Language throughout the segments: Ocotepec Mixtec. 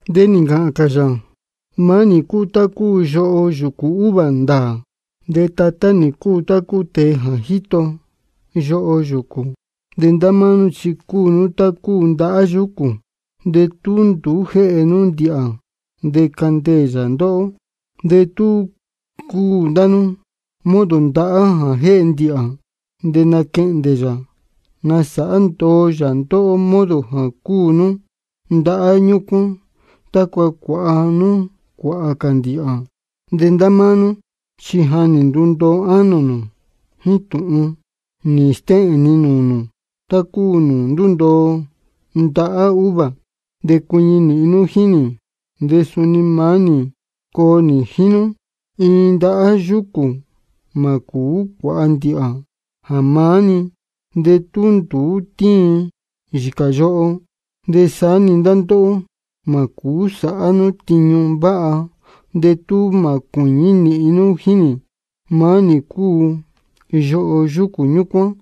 De nī ncāhān cā yā: Maá nī cúu tá cúu yoho yūcū uva ndāā, de Tatá nī cúu tá cúu tēe jā jíto yoho yúcū. De ndá máá nú chi cúu nú tá cúu ndahá yúcū, de tú nduú jéhe nú ndīhā de candeē yā ndóhó. De tú cúu ndá nú modo ndahá jā jéhe ndīhā, de naquehndē yā nasāhá ndoo yā ndóhó modo jā cúu nú ndahá ñúcuán, tácua cuāha nú cuāhā cā ndīhā. De ndá máá nú chi ja nī ndundoo ánō nū jíín tūhun nī stéhēn ni nūū nū, tá cúu nūū ndúndoo ndahá uva. De cuiñi nīhin nú jíín nī, de suni maá nī coo nī jíín nú. Iin ndahá yúcū mā cūú cuāha ndīhā jā maá-ni, de tú nduú tíin yīcā yoho. De saá-ni ndá ndóhó, mā cūú sāhá nú tiñu váha de tú mā cuīñí nīhin nú jíín nī. Maá nī cúu yoho yúcū ñúcuán,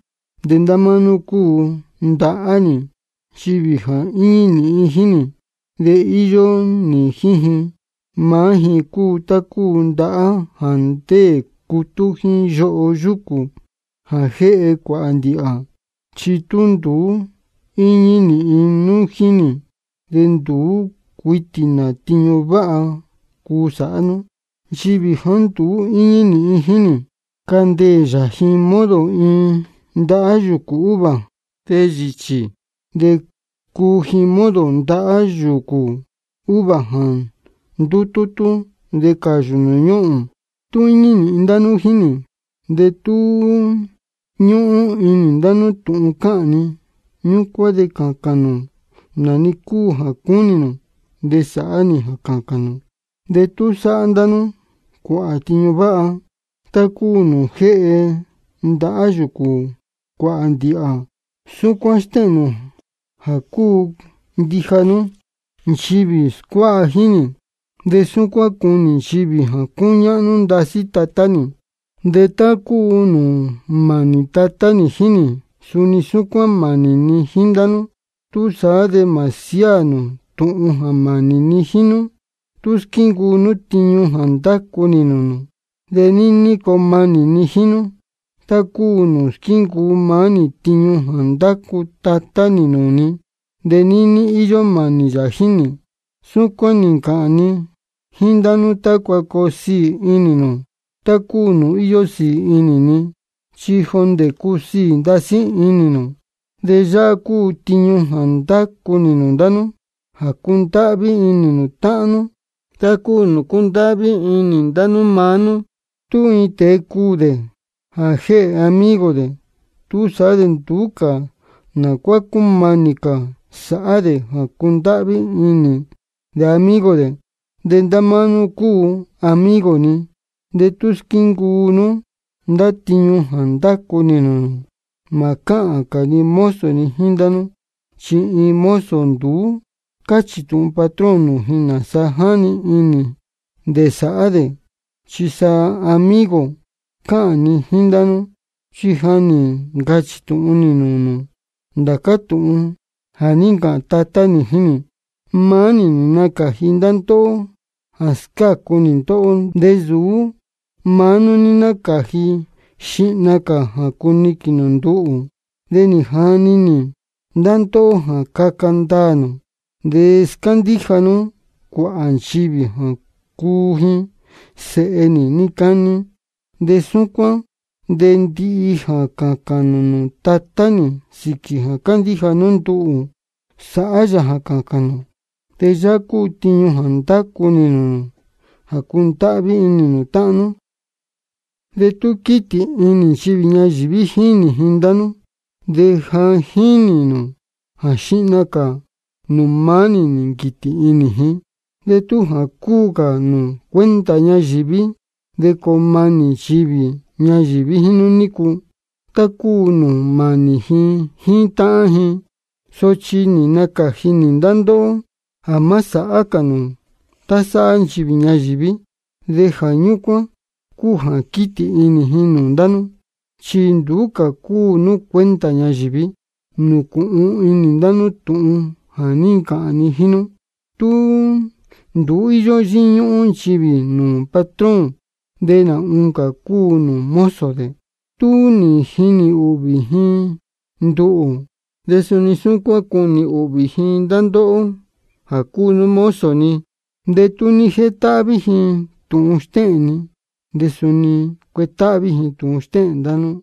de ndá máá nú cúu ndahá nī. Nchivī jā íñí nīhin jíín nī, de íyó nī jíín ji, maá ji cúu tá cúu ndahá jā ndéē cutú jíín yoho yúcū jā jéhe cuāhā ndīhā. Chi tú nduú íñí nīhin nú jíín nī, de nduú cuitī nā tiñu váha cuu sāhá nú. Nchivī jāá nduú íñí nīhin jíín nī, candeē yā ji modo iin ndahá yūcū uva, de yīchī. De cuu ji modo ndahá yūcū uva jā ndutútú de cāyū nūū ñúhūn. Tú íñí nīhin ndá nú jíín nī, de tú ñúhún inī nū ndá tūhun cáhān ni, ñúcuán de cācān nū nā-ni cúu jā cúnī nū, de sāhá nī jā cācān nū. De tú sāhá ndá nú cuāhā tiñu váha, tá cúu nūū jéhe ndahá yúcū cuāhā ndīhā, súcuán stéhēn nū jā cúu ndija nú nchivī scuáha jíín nī, de súcuán cunī nchivī jā cúñáhnú ndasí Tatá nī. De tá cúu nūū mānī Tatá nī jíín nī, suni súcuán mānī ni jíín ndá nú. Túsaá de mā siáā nū tūhun jā mānī ni jíín nú. Tú squíncuu nú tiñu nī ndacu nī nūū nū, de níní coo manī ni jíín nú, tá cúu nūū squíncuu maá nī tiñu nī ndacu Tatá nī nūū ni, de níní íyó mānī yā jíín nī. Súcuán nī ncāhān ni jíín ndá nú tácua coo siī inī nū tá cúu nūū íyó sīī inī ni, chi jondē cusiī ndasí inī nū. De yáhá cúu tiñu jā ndácu nī nūū ndá nú: Jā cundáhví inī nū táhán nú, tá cúu nūū cúndáhví inī ni ndá máá nú. Tú iin tēe cuū dē jā jéhē amigo dē, túsaá de nduú cā nā cuá cúmanī cā sāhá dē jā cundáhví inī dē amigo dē. De ndá máá nú cúu amigo ni de tú squíncuu nú ndá tiñu jā ndácu nī nūū nū. Mā cáhān cā ni mozo jíín ndá nú, chi iin mozo nduú cáchī tūhun patrón nūū ji nāsa jáni inī dē sāhá dē. Chi sa amigo cáhān ni jíín ndá nú, chi ja nī ncachī tūhun nī nūū nū ndācá tūhun jā ní ncāhān Tatá nī jíín nī. Maá nī nī nacāji ndá ndóhó jā scácu nī ndóhó, de nsūú ndá máá nú nī nacani inī xihna cā jā cuniquīn nū nduhū. De nī jani nī ndá ndóhó jā caca ndaā nū de scándíja nú cuāhā nchivī jā cuu ji sēhe nī níí cání. De súcuán de ndihi jā cācān nū nūū Tatá nī sīquī jā cándíja nú nduhū, sāhá yā jā cācān nū. De yáhá cúu tiñu jā ndácu nī nūū nū: Jā cundáhví inī nū táhán nú. De tú quítī inī nchivī ñayīví jínī ji ndá nú, de ja jínī nū jā xihna cā nūū maá nī nī nquītī inī ji. De tú jā cúu cā nū cuenta ñayīví, de coo manī nchivī ñayīví jíín nú nícu, tá cúu nūū mānī ji jíín táhán ji. Sochi nī nacāji nī ndá ndóhó jā má sāhá cā nū tá sáhá nchivī ñayīví. De jā ñúcuán cúu jā quítī inī ji nūū ndá nú, chi nduú cā cúu nú cuenta ñayīví. Nūcūhun inī ndá nú tūhun jā ní ncāhān ni jíín nú: Tú nduú íyó yíñúhún nchivī nūū patrón, de nā oncā cúu nūū mozo dē. Tú nī jinī ūhvī ji nduhū, de suni súcuán cunī ūhvī ji ndá ndóhó jā cúu nú mozo ni. De tú nī jetáhví ji tūhun stéhēn ni, de suni cuetáhví ji tūhun stéhēn ndá nú.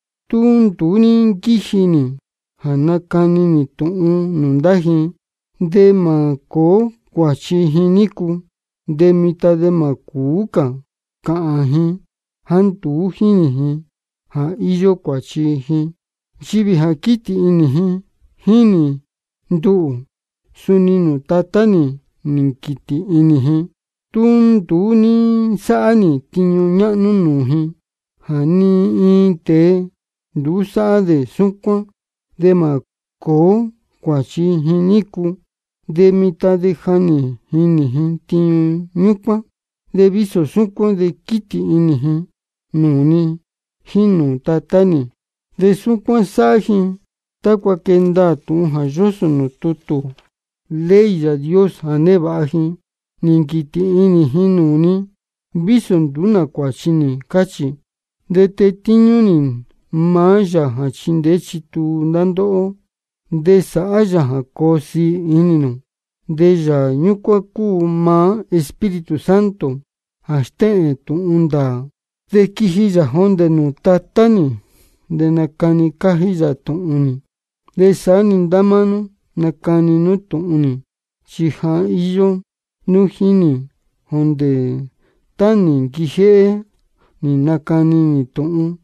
Tú nduú ní nquíji nī jā nacani nī tūhun nūū ndá ji, de mā cōó cuāchi ji nícu. De mitan de mā cūú cā cāhān ji jāá nduú jínī ji jā íyó cuāchi ji. Nchivī jā quítī inī jínī nduhū, suni nūū Tatá nī quítī inī ji. Tú nduú ní nsáhá nī tiñu ñáhnú nūū ji jā ni iin tēe nduú sáhá dē súcuán, de mā cōó cuāchi ji nícu. De mitan de ja nī jinī ji tiñu ñúcuán, de vísō súcuán de quítī inī ji nūū ni jíín nūū Tatá nī. De súcuán sáhá ji tácua quee ndaā tūhun jā yósō nūū tutū ley Yāā Dios jā névāha ji: Nī nquītī inī ji nūū ni, vísō nduú nā cuāchi nī, cáchī. De tetíñú nī maá Yāā jā chindeé chituu ndá ndóhó de sāhá yā jā coo siī inī nū. De Yāā ñúcuán cúu maá Espíritu Santo jā stéhēn tūhun ndāā, de quiji yā jondē nūū Tatá nī, de nacani cájí yā tūhun nī. De saá-ni ndá máá nú nacani nú tūhun nī, chi ja íyó nú jíín nī jondē tá nī nquijéhé nī nacani nī tūhun.